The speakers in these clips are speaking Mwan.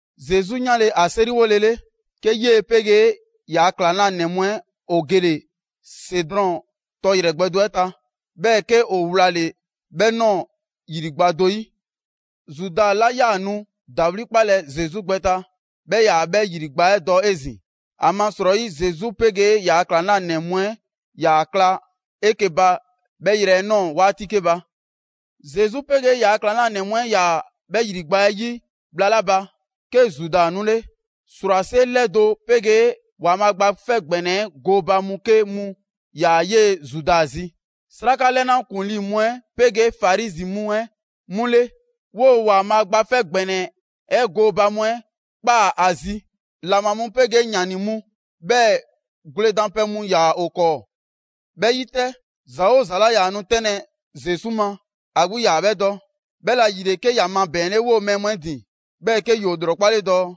Zesu 'yanle‑ ‑a 'seriwolele, 'ke 'yee‑ 'pegee ‑yaa' ‑klaŋlanɛ mu 'ɛ ‑o gele‑ Sedrɔn tɔ ‑yrɛ gbɛ do 'ɛ ta. 'Bhɛɛ‑ 'ke ‑o wlale‑ 'bhɛ ꞊nɔɔ ‑yrigba' do 'yi. Zuda 'la 'yaa‑ nu ‑dawli' 'kpalɛ‑ Zesu gbɛ ta, 'bhɛ 'yaa‑ 'bhɛ ‑yrigba' 'ɛ dɔ 'ezin‑. ‑Amasrɔyi Zesu 'pegee ‑yaa' ‑klaŋlanɛ mu 'ɛ 'yaa‑ ꞊kla 'eke‑ ba 'bhɛ yrɛ 'ɛ ꞊nɔɔ 'waati 'ke ba. Zesu 'pegee ‑yaa' ‑klaŋlanɛ mu 'ɛ 'yaa‑ 'bhɛ ‑yrigba' 'ɛ 'yi bhla 'la ba, 'ke Zuda 'nule. 'Srwase 'lɛdo‑ 'pegee ‑Waanbhaa' Gba 'Fɛ ‑Gbɛnɛ 'ɛ gooba mu 'ke mu ‑yaa 'yee‑ Zuda zi. 'Sraka 'lɛna ‑kuŋlii mu 'ɛ 'pegee Farizi mu 'ɛ 'mu ‑le 'woo‑ ‑Waanbhaa' Gba 'Fɛ ‑Gbɛnɛ 'ɛ gooba mu 'ɛ ꞊kpaa ‑a zi. ‑Laŋbha mu 'pegee ‑yani mu, 'bhɛɛ‑ gwledanpɛ mu ‑yaa ‑o 'kɔɔ. 'Bhɛ 'yi 'tɛ, ‑za 'oo ‑za 'la 'yaa‑ nu 'tɛnlɛ‑ Zesu ma, ‑a 'gbu 'yaa‑ 'bhɛ dɔ. 'Bhɛla‑ ‑yile 'ke ‑ya mabɛɛnle 'woo‑ mɛɛ mu 'ɛ ‑din, 'bhɛɛ‑ 'ke ‑yoo ‑lrɔkpale dɔɔ: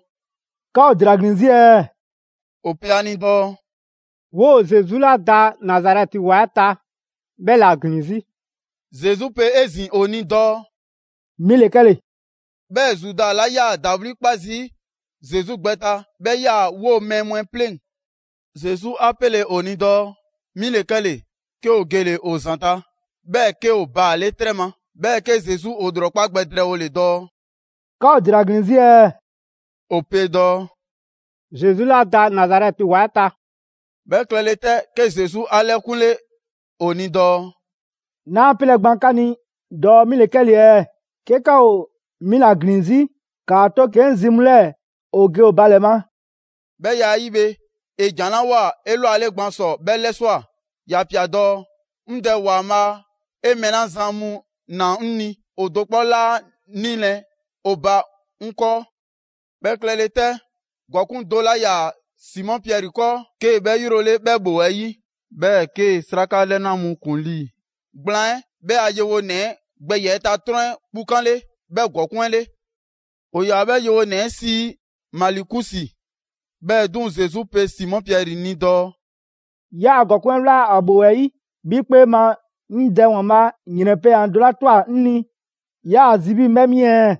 «'Ka ‑o ‑dela ‑glin 'zi ɛɛ?» ‑O pe a ni dɔɔ: «'Woo‑ Zesu 'la da Nazarɛti ‑wa 'ɛ ta 'bhɛ ‑la ‑glin 'zi.» Zesu pe 'ezin‑ ‑o ni dɔɔ: «'Mi ‑le 'kɛle‑.» 'Bhɛɛ‑ Zuda 'la 'yaa‑ ‑dawli' 'kpa zii' Zesu gbɛ ta 'bhɛ 'yaa‑ 'woo‑ mɛɛ mu 'ɛ 'pleŋ‑. Zesu 'a 'pele‑ ‑o ni dɔɔ: «'Mi 'le 'kɛle‑». 'Ke ‑o gele‑ ‑o ‑zanta', 'bhɛɛ‑ 'ke ‑o baale' 'trɛ ma. 'Bhɛɛ‑ 'ke Zesu ‑o ‑lrɔkpa' gbɛ drɛɛwole dɔɔ: «'Ka ‑o ‑dela ‑glin 'zi ɛɛ?» ‑O pe dɔɔ: «Zesu 'la da Nazarɛti ‑wa 'ɛ ta.» 'Bhɛ klɛle 'tɛ, 'ke Zesu 'a 'lɛkunle ‑o ni dɔɔ: «'Naa 'pelɛ‑ gban 'ka ni dɔɔ 'mi ‑le 'kɛle‑ ɛɛ? 'Ke 'ka ‑o 'mi ‑la ‑glin 'zi, ‑kaa 'to 'ke 'ŋ zi mu 'lɛɛ‑ ‑o ge ‑o ba ‑lɛ ma.» 'Bhɛ ya 'ɛ 'yi bhe, ‑e ‑jan 'la ꞊woa 'elwale gban ‑sɔ 'bhɛ 'lɛswa꞊: ‑ya pia‑ dɔɔ: «'Ŋ Dɛ ‑Waanbhaa', 'e mɛɛ 'la zan mu ꞊naa 'ŋ ni ‑o do 'kpɔ 'laa 'nilɛ‑ ‑o ba 'ŋ 'kɔɔ.» 'Bhɛ klɛle 'tɛ, ‑gɔkuŋ' do 'la 'yaa‑ Simɔ Piɛri 'kɔɔ, 'kee‑ 'bhɛ 'yrole 'bhɛ 'bhoo‑ 'ɛ 'yi, 'bhɛɛ‑ 'kee‑ 'sraka 'lɛna mu ‑kuŋlii gblaan 'ɛ 'bhɛ a yewonɛ 'ɛ gbɛ ‑yiɛ' ta 'trɔn kpukanle 'bhɛ ‑gɔkuŋ' 'ɛ 'le. ‑O ‑yaa 'bhɛ yewonɛ 'ɛ sii Malikusi. 'Bhɛɛ‑ 'duŋ‑, Zesu pe Simɔ Piɛri ni dɔɔ: «'Yaa‑ ‑gɔkuŋ' 'ɛ 'wla ‑a ‑bhoo 'ɛ 'yi. 'Bhi 'kpee ma, 'ŋ Dɛ ‑Waanbhaa' ‑yrɛn pɛyan‑ do 'la ꞊twa 'ŋ ni 'naa ‑a zi 'bhii‑ 'ŋ 'bhɛ 'mi ɛɛ?»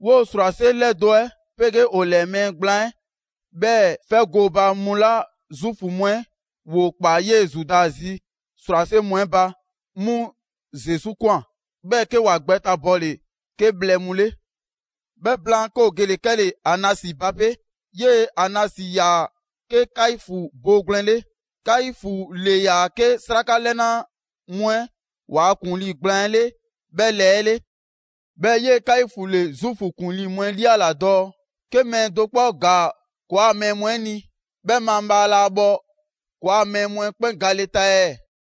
'Woo‑ ‑srwase' 'lɛdo‑ 'ɛ 'pegee ‑o ‑lɛɛ mɛɛ gblaan 'ɛ, 'bhɛɛ‑ 'fɛ gooba mu 'la Zuufu mu 'ɛ ‑woo ‑kpaa 'yee‑ Zuda zi ‑srwase' mu 'ɛ ba, 'mu Zesu ꞊kwan, 'bhɛɛ‑ 'ke ‑wa gbɛtabɔle 'ke bhlɛ mu 'le. 'Bhɛ blaan, 'ke ‑o gele‑ 'kɛle‑ Anasi ba 'pe. 'Yee‑ Anasi‑yaa 'ke Kaifu boogwlɛn 'le. Kaifu ‑le ‑yaa 'ke 'sraka 'lɛna mu 'ɛ ‑waa' ‑kuŋlii gblaan 'ɛ 'le 'bhɛ lɛɛ 'ɛ 'le. 'Bhɛɛ‑ 'yee‑ Kaifu ‑le Zuufu ‑kuŋlii mu 'ɛ 'liala‑ dɔɔ: «'Ke mɛɛ do 'kpɔ ‑gaa ‑kɔɔa' mɛɛ mu 'ɛ ni, 'bhɛ mabhaa laa bhɔ ‑kɔɔa' mɛɛ mu 'ɛ 'kpɛn gale ta ɛɛ?»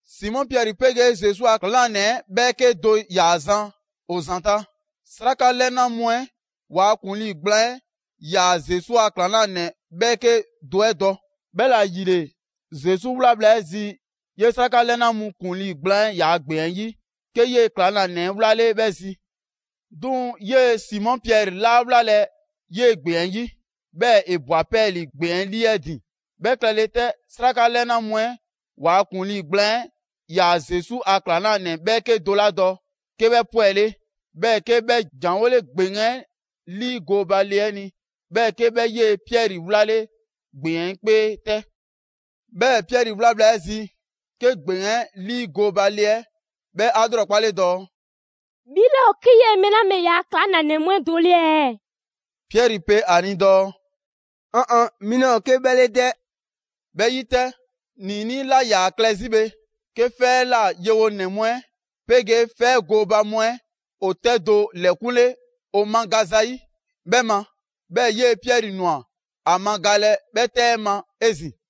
Simɔ Piɛri 'pegee Zesu a ‑klaŋlanɛ 'ɛ 'bhɛɛke do ‑yaa zan ‑o ‑zanta'. 'Sraka 'lɛna mu 'ɛ ‑waa' ‑kuŋlii gblaan 'ɛ 'yaa‑ Zesu a ‑klaŋlanɛ 'bhɛɛke do 'ɛ dɔ. 'Bhɛla‑ ‑yile, Zesu 'wla bhla 'ɛ zi 'yee‑ 'sraka 'lɛna mu ‑kuŋlii gblaan 'ɛ ‑yaa' ‑gbeŋ 'ɛ 'yi, 'ke 'yee‑ ‑klaŋlanɛ 'ɛ wlale‑ 'bhɛ zi. 'Duŋ‑ 'yee‑ Simɔ Piɛri 'laa wlalɛ‑ 'yee‑ ‑gbeŋ 'ɛ 'yi, 'bhɛɛ‑ ‑e ꞊bwa 'pɛɛlii‑ ‑gbeŋ 'lii 'ɛ ‑din. 'Bhɛ klɛle 'tɛ, 'sraka 'lɛna mu 'ɛ ‑waa' ‑kuŋlii gblaan 'ɛ 'yaa‑ Zesu a ‑klaŋlanɛ 'bhɛɛke do 'la dɔ, 'ke 'bhɛ 'pwɛle, 'bhɛɛ‑ 'ke 'bhɛ ‑janwole ‑gbeŋ 'ɛ 'liigooba le 'ɛ ni, 'bhɛɛ‑ 'ke 'bhɛ 'yee‑ Piɛri 'wlale ‑gbeŋ 'ɛ 'kpee 'tɛ. 'Bhɛɛ‑ Piɛri 'wla bhla 'ɛ zi, 'ke ‑gbeŋ 'ɛ 'lii gooba le 'ɛ 'bhɛ 'a 'lrɔkpale dɔɔ: «'Bhi 'laa ‑o 'ke 'yee‑ mɛɛ 'la bhe ‑yaa' ‑klaŋlanɛ mu 'ɛ do 'le ɛɛ?» Piɛri pe ‑a ni dɔɔ: «'Ɔn ɔn, 'mi 'laa ‑o 'ke 'bhɛ 'le 'dɛ!» 'Bhɛ 'yi 'tɛ, ‑niinii' 'la 'yaa‑ klɛ zi bhe, 'ke 'fɛ 'ɛ ꞊la yewonɛ mu 'ɛ 'pegee 'fɛ 'ɛ gooba mu 'ɛ ‑o 'tɛ do ‑lɛkunle ‑o magaza 'yi 'bhɛ ma. 'Bhɛɛ‑ 'yee‑ Piɛri ꞊nwa ‑a magalɛ 'bhɛ 'tɛ 'ɛ ma 'ezin‑.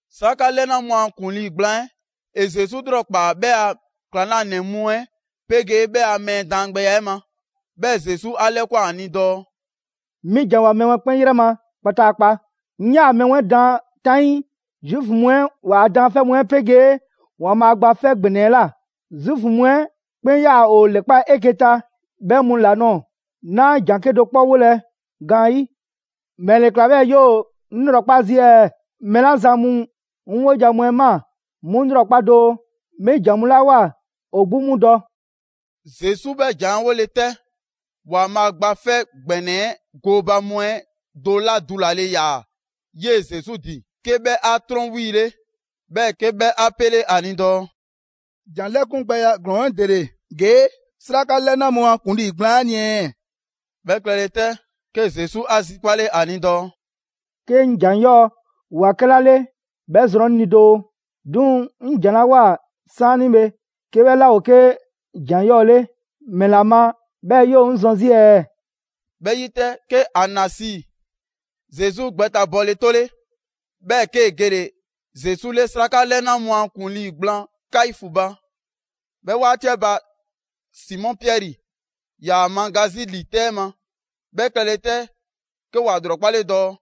'Sraka 'lɛna mu a ‑kuŋlii gblaan 'ɛ ‑e Zesu 'lrɔkpaa‑ 'bhɛ a ‑klaŋlanɛ mu 'ɛ 'pegee 'bhɛ a mɛɛ daangbɛya 'ɛ ma. 'Bhɛɛ‑ Zesu 'a 'lɛkwan‑ ‑a ni dɔɔ: «'Mi ‑janwoa mɛɛ mu 'ɛ 'kpɛn 'yrɛ ma kpataakpa. 'Ŋ 'yaa‑ mɛɛ mu 'ɛ daan 'taŋii Zuufu mu 'ɛ ‑waa' daanfɛ' mu 'ɛ 'pegee ‑Waanbhaa' Gba 'Fɛ ‑Gbɛnɛ 'ɛ ꞊la, Zuufu mu 'ɛ 'kpɛn 'yaa‑ ‑o ‑lɛkpa' 'eke‑ ta 'bhɛ mu ‑la nɔɔ‑; 'naa ‑jan 'kedo‑ 'kpɔ wolɛ gaanyi'. ‑Mɛle ‑kla 'bhɛɛ‑ 'yoo‑ 'ŋ 'lrɔkpa zii' ɛɛ? Mɛɛ 'la zan mu 'ŋ 'wojan‑ mu 'ɛ ꞊maa, 'mu ‑lrɔkpa' doo. 'Mi ‑jan mu 'la ꞊woa, ‑o 'gbu 'mu dɔ.» Zesu 'bhɛ ‑jan 'ɛ 'wole‑ 'tɛ, ‑Waanbhaa' Gba 'Fɛ ‑Gbɛnɛ 'ɛ gooba mu 'ɛ do 'la dulale ‑yaa 'yee‑ Zesu ‑din, 'ke 'bhɛ 'a 'trɔn 'wiile, 'bhɛɛ‑ 'ke 'bhɛ 'pele‑ 'a ni dɔɔ: «‑Jan 'lɛkungbɛya 'ɛ ‑glɔɔn 'ɛ ‑dele ‑gee' sraka 'lɛna mu a ‑kuŋlii gblaan 'ɛ ni ɛɛ?» 'Bhɛ klɛle 'tɛ, 'ke Zesu 'a zikpale ‑a ni dɔɔ: «'Ke 'ŋ ‑jan 'yɔɔ‑ ‑woa 'kɛla 'le 'bhɛ zrɔn 'ŋ ni doo; 'duŋ‑ 'ŋ ‑jan 'la ꞊woa 'saanibhe, 'ke 'bhɛ 'laa ‑o 'ke ‑jan 'yɔɔ‑ 'le, ‑mɛla ma 'bhɛɛ‑ 'yoo‑ 'ŋ zɔn 'zi ɛɛ?» 'Bhɛ 'yi 'tɛ, 'ke Anasi Zesu gbɛtabɔle 'tole, 'bhɛɛ‑ 'kee‑ gele‑ Zesu 'le 'sraka 'lɛna mu a ‑kuŋlii gblaan Kaifu ba. 'Bhɛ 'waati 'ɛ ba, Simɔ Piɛri ‑yaa ‑a maga 'zi ‑li 'tɛ 'ɛ ma. 'Bhɛ klɛle 'tɛ, 'ke ‑wa ‑lrɔkpale dɔɔ: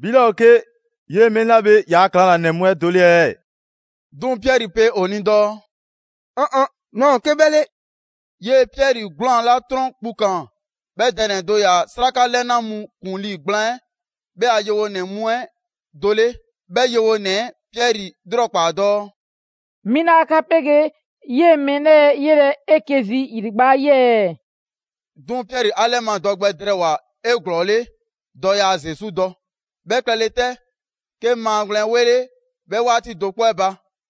«'Bhi 'laa ‑o 'ke 'yee‑ mɛɛ 'la bhe ‑yaa' ‑klaŋlanɛ mu 'ɛ do 'le ɛɛ?» 'Duŋ‑ Piɛri pe ‑o ni dɔɔ: «'Ɔn ɔn, 'naa ‑o 'ke 'bhɛ 'le.» 'Yee‑ Piɛri 'gwlaan‑ 'la 'trɔn kpukaan, 'bhɛ dɛ ‑nɛ do ‑yaa 'sraka 'lɛna mu ‑kuŋlii gblaan 'ɛ 'bhɛ a yewonɛ mu 'ɛ do 'le. 'Bhɛ yewonɛ 'ɛ Piɛri 'lrɔkpaa‑ dɔɔ: «'Mi 'laa 'ka 'pegee 'yee‑ mɛɛ 'lɛɛ‑ 'yelɛ‑ 'eke‑ 'zi ‑yrigba' 'ɛ 'yi ɛɛ?» 'Duŋ‑ Piɛri 'a 'lɛmadɔ gbɛ drɛɛwoa‑ 'eglɔɔle dɔɔ yaa Zesu dɔ. 'Bhɛ klɛle 'tɛ, 'ke maagwlɛn ‑wele' 'bhɛ 'waati do 'kpɔ 'ɛ ba.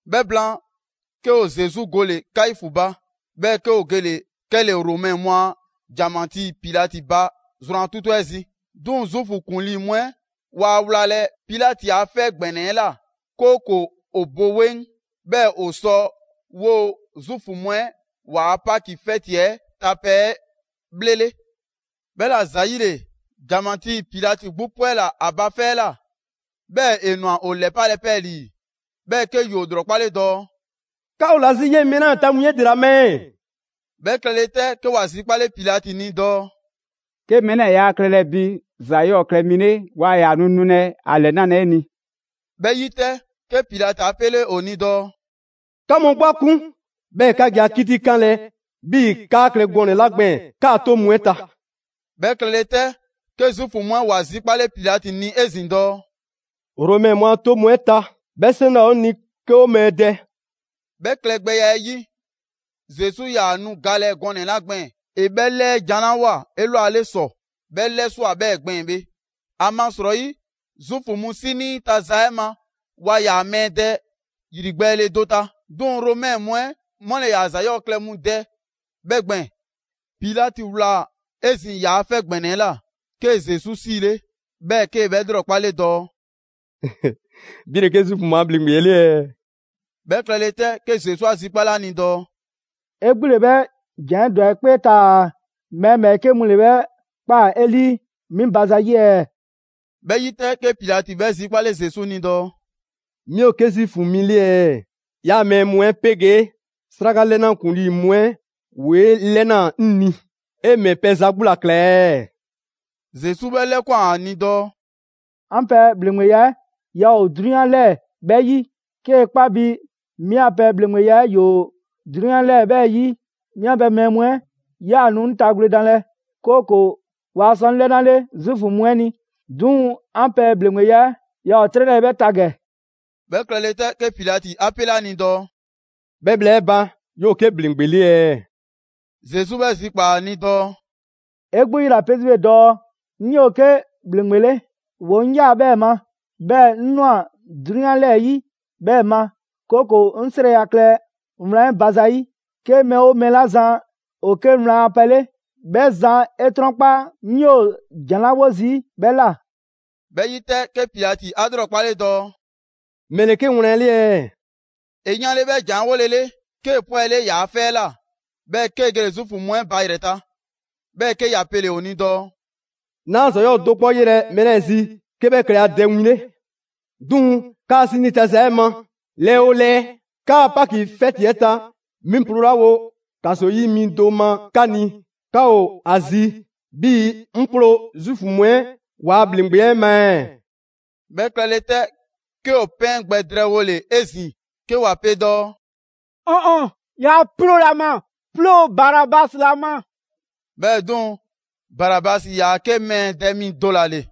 'Bhɛ blaan, 'ke ‑o Zesu gole‑ Kaifu ba, 'bhɛɛ‑ 'ke ‑o gele‑ 'kɛle‑ Romɛ mu a ‑janmatii Pilati ba zrwan 'tutu 'ɛ zi. 'Duŋ‑ Zuufu ‑kuŋlii mu 'ɛ waa wlalɛ Pilati a 'fɛ ‑gbɛnɛ 'ɛ ꞊la; 'kooko‑ ‑o bo 'weŋ, 'bhɛɛ‑ ‑o sɔ 'woo‑ Zuufu mu 'ɛ ‑waa' Paki 'fɛti 'ɛ ta pɛ 'ɛ 'bhlele. 'Bhɛla‑ ‑zayile, ‑janmatii Pilati 'gbu 'pwɛla‑ ‑a ba 'fɛ 'ɛ ꞊la, 'bhɛɛ‑ ‑e ꞊nwa ‑o ‑lɛpalɛ 'pɛɛlii‑. 'Bhɛɛ‑ 'ke ‑yoo ‑lrɔkpale dɔɔ: «'Ka ‑o ‑la 'zi 'yee‑ mɛɛ 'lɛɛ‑ ta win 'ɛ ‑dela ma ɛɛ?» 'Bhɛ klɛle 'tɛ, 'ke ‑wa zikpale Pilati ni dɔɔ: «'Ke mɛɛ 'lɛɛ‑ yaa klɛlɛ bi ‑za 'yɔɔ‑ klɛ mi 'le, 'waa ‑yaa nu nulɛ ‑a ‑lɛnalɛ 'e ni.» 'Bhɛ 'yi 'tɛ, 'ke Pilati 'a 'pele ‑o ni dɔɔ: «'Ka mu 'gbu 'a 'kun, 'bhɛɛ‑ 'ka ge ‑a 'kitikanlɛ 'bhii‑ 'kaa klɛ gɔnɛ‑ 'la gbɛɛn‑ 'kaa‑ 'toŋ mu 'ɛ ta.» 'Bhɛ klɛle 'tɛ, 'ke Zuufu mu 'ɛ ‑wa zikpale Pilati ni 'ezin‑ dɔɔ: «Romɛ mu a 'toŋ mu 'ɛ ta, 'bhɛ 'seŋ 'laa ‑o 'o ni 'ke ‑o mɛɛ dɛ.» 'Bhɛɛ‑ klɛgbɛya 'ɛ 'yi, Zesu 'yaa‑ nu galɛ gɔnɛ‑ 'la gbɛɛn‑ ‑e 'bhɛ 'lɛɛjanlawoa 'elwale ‑sɔ, 'bhɛ 'lɛswa꞊ 'bhɛɛ‑ gbɛɛn‑ bhe. (‑Amasrɔyi Zuufu mu 'sinii ta za 'ɛ ma waa ‑yaa mɛɛ dɛ ‑yrigbɛɛle do ta, 'duŋ‑ Romɛ mu 'ɛ 'mu ‑le ‑yaa ‑za 'yɔɔ‑ klɛ mu dɛ 'bhɛ gbɛɛn‑.) Pilati ꞊wlaa 'ezin‑ ‑yaa' 'fɛ ‑gbɛnɛ 'ɛ ꞊la, 'kee‑ Zesu 'siile, 'bhɛɛ‑ 'kee‑ 'bhɛ 'lrɔkpale dɔɔ: «'Bhi ‑le 'ke Zuufu mu a ‑bhleŋgbe 'le ɛɛ?» 'Bhɛ klɛle 'tɛ, 'ke Zesu 'a zikpale ‑a ni dɔɔ: «'E 'gbu ‑le 'bhɛ ‑jan 'ɛ ‑dwa 'e 'kpee taa‑ mɛɛ ‑bhɛɛke' mu ‑le 'bhɛ ꞊kpaa 'e 'lii 'mi ba zayi' ɛɛ?» 'Bhɛ 'yi 'tɛ, 'ke Pilati 'bhɛ zikpale Zesu ni dɔɔ: «'Mi ‑o 'ke Zuufu mi 'le ɛɛ? 'Yaa‑ mɛɛ mu 'ɛ 'pegee 'sraka 'lɛna ‑kuŋlii mu 'ɛ ‑woo 'e 'lɛnaa‑ 'ŋ ni, 'e ‑mɛ pɛ za 'gbu ‑la ‑kla ɛɛ?» Zesu 'bhɛ 'lɛkwan‑ ‑a ni dɔɔ: «'An pɛ ‑bhleŋgbeya 'ɛ ‑yaa ‑o 'drunyan 'lɛɛ‑ 'bhɛ 'yi. 'Kee‑ 'kpa bi 'mi a pɛ ‑bhleŋgbeya 'ɛ ‑yoo 'drunyan 'lɛɛ‑ 'bhɛ 'yi, 'mi a pɛ mɛɛ mu 'ɛ 'yaa‑ nu 'ŋ ta gwledanlɛ, 'kooko‑ waa sɔ 'ŋ 'lɛnale Zuufu mu 'ɛ ni. 'Duŋ‑ 'an pɛ ‑bhleŋgbeya 'ɛ yaa ‑o 'trɛ 'lɛɛ‑ 'bhɛ ta ‑gɛ.» 'Bhɛ klɛle 'tɛ, 'ke Pilati 'a 'pele ‑a ni dɔɔ: «'Bhɛ bhla 'ɛ ba, 'yoo‑ 'ke ‑bhleŋgbe 'le ɛɛ?» Zesu 'bhɛ zikpaa‑ ‑a ni dɔɔ: «'E 'gbu 'yela‑ pe 'zi bhe dɔɔ: ‹'ŋ 'yoo‑ 'ke ‑bhleŋgbe 'le›. ‑Woo' 'ŋ ꞊yaa 'bhɛɛ‑ ma, 'bhɛɛ‑ 'ŋ ꞊nwa 'drunyan 'lɛɛ‑ 'yi 'bhɛɛ‑ ma, 'kooko‑ 'ŋ 'srɛya‑ klɛ wlan 'ɛ ba zayi'. 'Ke mɛɛ 'oo mɛɛ 'la zan ‑o 'ke wlan a pɛ 'le, 'bhɛ zan 'e 'trɔnkpa 'ŋ 'yoo‑ ‑jan 'la 'wo zii' 'bhɛ ꞊la.» 'Bhɛ 'yi 'tɛ, 'ke Pilati 'a 'lrɔkpale dɔɔ: «‑Mɛle ke wlan 'le ɛɛ?» ‑E yanle‑ 'bhɛ ‑jan 'ɛ 'wolele, 'kee‑ 'pwɛle ‑yaa' 'fɛ 'ɛ ꞊la, 'bhɛɛ‑ 'kee‑ gele‑ Zuufu mu 'ɛ ba ‑yrɛ ta. 'Bhɛɛ‑ 'ke ‑ya pele‑ ‑o ni dɔɔ: «'Naa ‑za 'yɔɔ‑ do 'kpɔ 'yelɛ‑ mɛɛ 'lɛɛ‑ zi 'ke 'bhɛ klɛ ‑a dɛ win 'le. 'Duŋ‑ 'kaa‑ 'sinii ta za 'ɛ ma, lɛɛ 'oo lɛɛ, 'kaa‑ Paki 'fɛti 'ɛ ta, 'mi ploolawo ‑kaso 'yi mi do ma 'ka ni, 'ka ‑o ‑a zi 'bhii‑ 'ŋ 'ploo‑ Zuufu mu 'ɛ ‑waa' ‑bhleŋgbe 'ɛ ma ɛɛ?» 'Bhɛ klɛle 'tɛ, 'ke ‑o 'pɛɛn gbɛ drɛɛwole 'ezin‑ 'ke ‑wa pe dɔɔ: «'Ɔn ɔn, 'yaa 'ploolɛ‑ ‑a ma! 'Ploo‑ Barabasi ‑la ma!» 'Bhɛɛ‑ 'duŋ‑ Barabasi ‑yaa 'ke mɛɛ dɛ mi do ‑la ‑le.